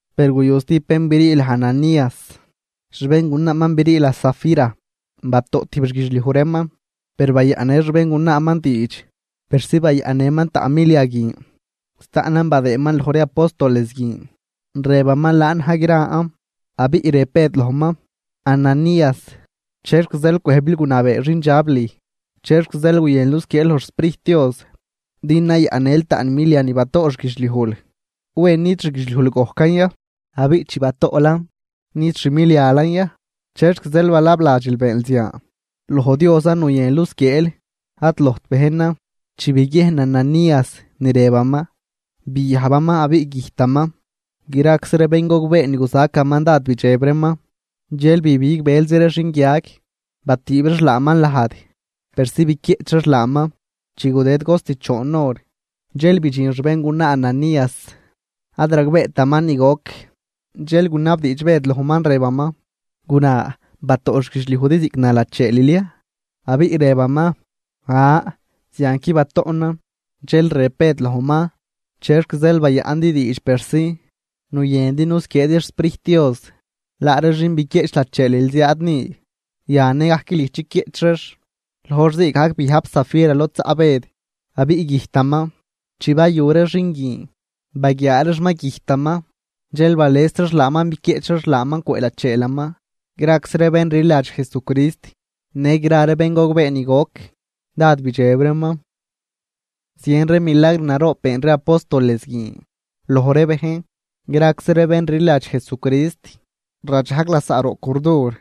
Per guyu stijb bén brii laj Ananías, xbéngunaaman brii laj Safira. Batoꞌ tijb xguidxliuj reeman, per bayaꞌnnë xbéngunaaman diidx persi bayaꞌnnëman taꞌn milia guin. Staꞌnan badëëman loj ree apóstoles guin, rëbaman laan na̱j gran. Abiꞌ rëb Bëd lojman: ―Ananías, ¿chexc zeel cwëjbil gunabee xindxab lüj? ¿Chexc zeel guyënl nusquieel loj xSprijt Dios, din nayaꞌnnël taꞌn milia ni batoꞌ xguidxliujl? ¿Wen nid xguidxliujl gojcan ya? Abiꞌ chi batoꞌlan, ¿nid xmilialan ya? ¿Chexc zeel balabladxil beenl zian? Loj Diosan nuyënl nusquieel, ad lojt bejnan. Chi biguiejn Ananías ni rëbaman, biajbaman abiꞌ güjtaman. Graczi ree bén gogbee ni guzacaman dád bidxeb reeman. Dxel bibig bëlzi ree xinguiag, batüüb reex laaman lajd persi biquieꞌch reex laaman. Chi gudëd cost choon hor, dxel bidxin xbéngunaa Ananías, ad ragbeetaman ni goc. Dxel gunabdiidx Bëd lojman rëbaman: ―Guna, ¿batoꞌ xguidxliujdi ziꞌc na lacheelil ya? Abiꞌ rëbaman: ―An, zianqui batoꞌnan. Dxel rëb Bëd lojman: ―¿Chexc zeel bayaꞌndi diidx persi nuyëndi nusquieedi xSprijt Dios? Laa ree xin biquieꞌch lacheelil ziaad ni, yan nëgajc lüj chiquieꞌch reex. Loj hor zii gajc biajb Safira lod zaꞌ Bëd, abiꞌ güjtaman. Chi bayu ree xin guin baguiaa reex ma güjtaman, dxel bales reex laaman biquieꞌch reex laaman cwëꞌ lacheelaman. Graczi ree bén rliladx Jesucrist në gra ree bén gogbee ni goc, dád bidxeb reeman. Zien ree milagr naroob been ree apóstoles guin loj ree bejn. Graczi ree bén rliladx Jesucrist radxajg lasaꞌ roꞌ curdur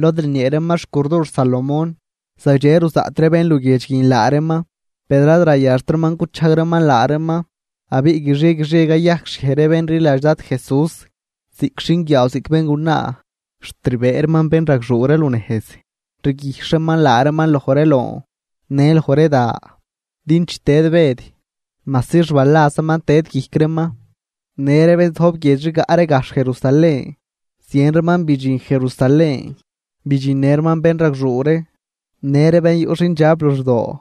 lod rniee reeman xcurdur Salomón. Zagdxe ruzaꞌt ree bén luguiedx guin laa reeman, per ad rayaxt reeman guchajg reeman laa reeman. Abiꞌ guixie guixie cayajcxhiej ree bén rliladx Dad Jesús, ziꞌc xinguiaaw ziꞌc béngunaa. Xt rbëë reeman bénragxuu ree lunejz, rguijxh reeman laa reeman loj ree loon në loj ree da, din chi tëd Bëd, majsi xbalazaman tëd guijc reeman. Në ree bén zojb guiedx rigaꞌ ree gajxh Jerusalén, zien reeman bidxin Jerusalén, bidxinnë reeman bénragxuu ree në ree bén yuꞌ xindxab luxdoo,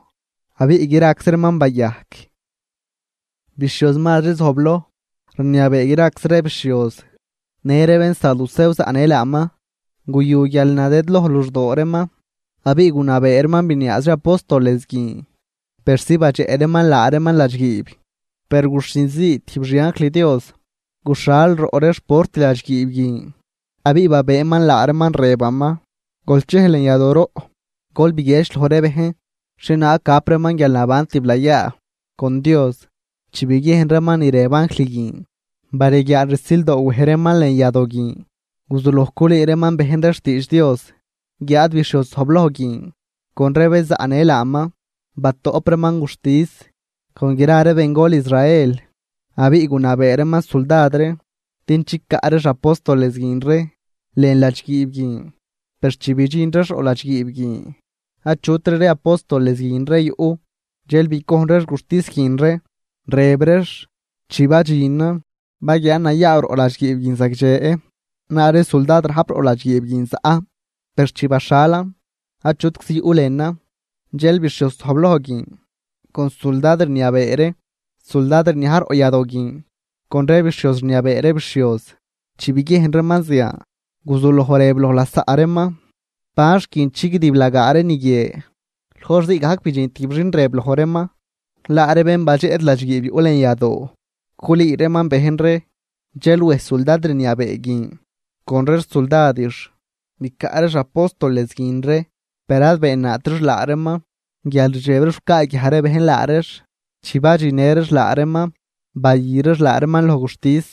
abiꞌ graczi reeman bayajc. Bixhioz mazri zojbloj rniabee graczi ree bixhioz në ree bénsaducew zaꞌnë laaman, guyu guialnadëdloj luxdoo reeman, abiꞌ gunabee reeman biniaaz ree apóstoles guin persi badxeꞌ reeman laa reeman ladxguiib. Per guxhin zii tijb xi anjl Dios guxhal roꞌ ree xport ladxguiib guin, abiꞌ babëëman laa reeman, rëbaman: ―Gol chej lën yadooroꞌ, gol biguiedx loj ree bejn xhie naag gap reeman guialnaban tiblayaa con Dios. Chi biguiejn reeman ni rëb anjl guin, bareguiaal rsildoo wej reeman lën yadoo guin, guzuloj culüü reeman bejn ree xtiidx Dios. Guiáad bixhioz zojbloj guin con ree bén zaꞌnë laaman, batoꞌp reeman guxtis con gra ree bengol Israel. Abiꞌ gunabee reeman suldad ree din chicaꞌ reex apóstoles guin ree lën ladxguiib guin. Per chi bidxin reex roꞌ ladxguiib guin, achutri ree apóstoles guin ree yuꞌ. Dxel bicojn reex guxtis guin ree, rëb reex: ―Chi badxinan, baguiaan nayaaw roꞌ ladxguiib guin zagdxe, laa ree suldad rajp roꞌ ladxguiib guin zaꞌ, per chi baxhalan, achutczi yuꞌ lënan. Dxel bixhioz zojbloj guin con suldad rniabee ree suldad rniaj roꞌ yadoo guin, con ree bixhioz rniabee ree bixhioz, chi biguiejn reeman zian, guzuloj rëb loj lasaꞌ reeman, ¿ban xt guin chigdiblagaa ree ni guie? Loj hor zii gajc bidxin tijb xin rëb loj reeman: ―Laa ree bén badxeꞌdi ladxguiib yuꞌ lën yadoo culüü reeman bejn ree. Dxel wej suldad rniabee guin con ree xsuldadix bicaꞌ reex apóstoles guin ree, per ad beennaat reex laa reeman guial rdxeb reex gucaaguiaj ree bejn laa reex. Chi badxinnë reex laa reeman, bayü reex laa reeman loj guxtis.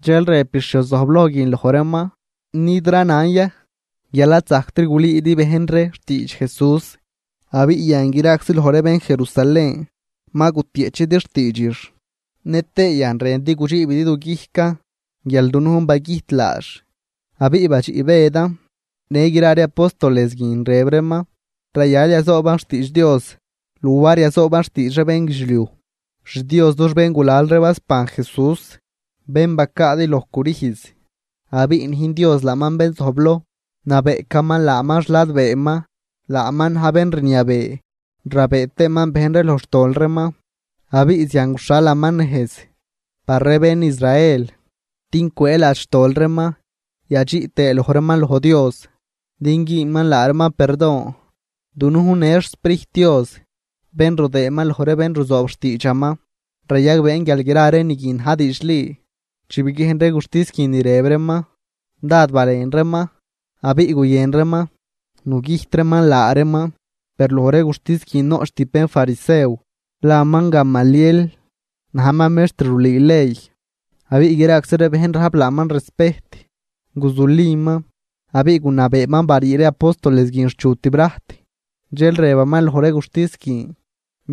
Dxel rëb bixhioz zojbloj guin loj reeman: ―¿Nid ranan ya guial ad zajctri gulüüdi bejn ree xtiidx Jesús? Abiꞌ yan graczi loj ree bén Jerusalén ma gutieꞌchidi xtiidxix, nëtëë yan rëndi gudxiibidi du guijcan guial dunujn bagüjt laax. Abiꞌ badxiꞌ Bëdan në gra ree apóstoles guin, rëb reeman: ―Rayal yazooban xtiidx Dios luar yazooban xtiidx ree bénguidxliuj. XDios dux béngulal ree basban Jesús, bén bacaadi loj crüjz. Abiꞌ nüjn Dios laaman bén zojbloj, nabeꞌcaman laaman xladbeeman, laaman na̱j bén rniabee rabëë tëëman bejn ree loj xtol reeman, abiꞌ zian guxhalaman nejz par ree bén Israel din cwëëladx xtol reeman yadxiꞌ tëë loj reeman loj Dios din güünman laa reeman perdon. Dunujn në xSprijt Dios bén rudëëman loj ree bén ruzoob xtiidxaman, rayagbeen guial gra ree ni guin na̱j diidxli. Chi biguiejn ree guxtis guin ni rëb reeman, dád balen reeman abiꞌ guyën reeman nugüjt reeman laa reeman. Per loj ree guxtis guin noꞌch tijb bénfarisew laman Gamaliel, najman mextr rulüü ley abiꞌ graczi ree bejn rajp laaman respejt. Guzuliman abiꞌ gunabeeman barii ree apóstoles guin xchu tibrajt. Dxel rëbaman loj ree guxtis guin: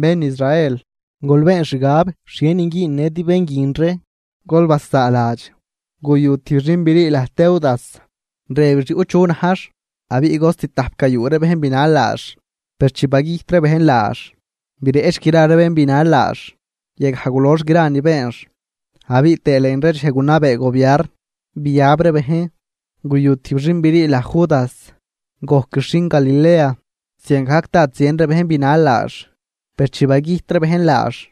―Bén Israel, gol been xgab xhienin güünnëdi bén guin ree. Gol basaaladx, guyu tijb xin brii laj Teudas, rëbix yuꞌ chu najx abiꞌ cost tajp gayuu ree bejn binal laax. Per chi bagüjt ree bejn laax, bireꞌch gra ree bén binal laax, yagaj gulox gra ni beenx. Abiꞌ tëë lën ree dxej gunabee gobiarn biab ree bejn, guyu tijb xin brii laj Judas, gojquix xin Galilea, ziangajc dád zien ree bejn binal laax. Per chi bagüjt ree bejn laax,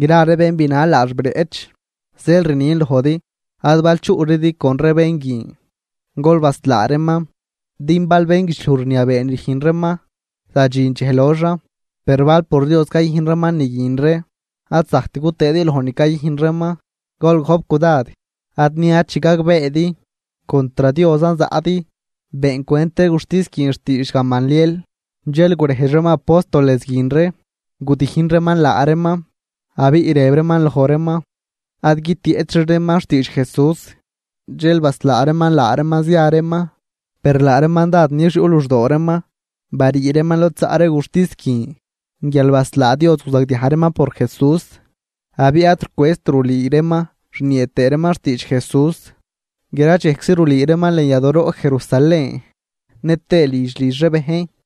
gra ree bén binal laax bireꞌch. Zeel rnin lojdi, ad bal chuꞌridi con ree bén guin, gol baslaa reeman. Din bal bénguidxliuj rniabee ni rüjn reeman, zadxin dxej loxan. Per bal por Dios cayüjn reeman ni guin ree, ad zajct gutëëdi loj ni cayüjn reeman. Gol gojp cudad ad niad chi gagbeedi contr Diosan zaꞌdi. Beencwent ree guxtis guin xtiidx Gamaliel, dxel gurejdx reeman apóstoles guin ree, gudijn reeman laa reeman abiꞌ rëb reeman loj reeman ad guitieꞌchri reeman xtiidx Jesús, dxel baslaa reeman laa reeman zia reeman. Per laa reeman dád nix yuꞌ luxdoo reeman barii reeman lod zaꞌ ree guxtis guin guial baslaa Dios guzagdiaj reeman por Jesús. Abiꞌ ad rucwëëzt rulüü reeman rniee tëë reeman xtiidx Jesús, gra dxejczi rulüü reeman lën yadooroꞌ Jerusalén nëtëë lidx lidx ree bejn.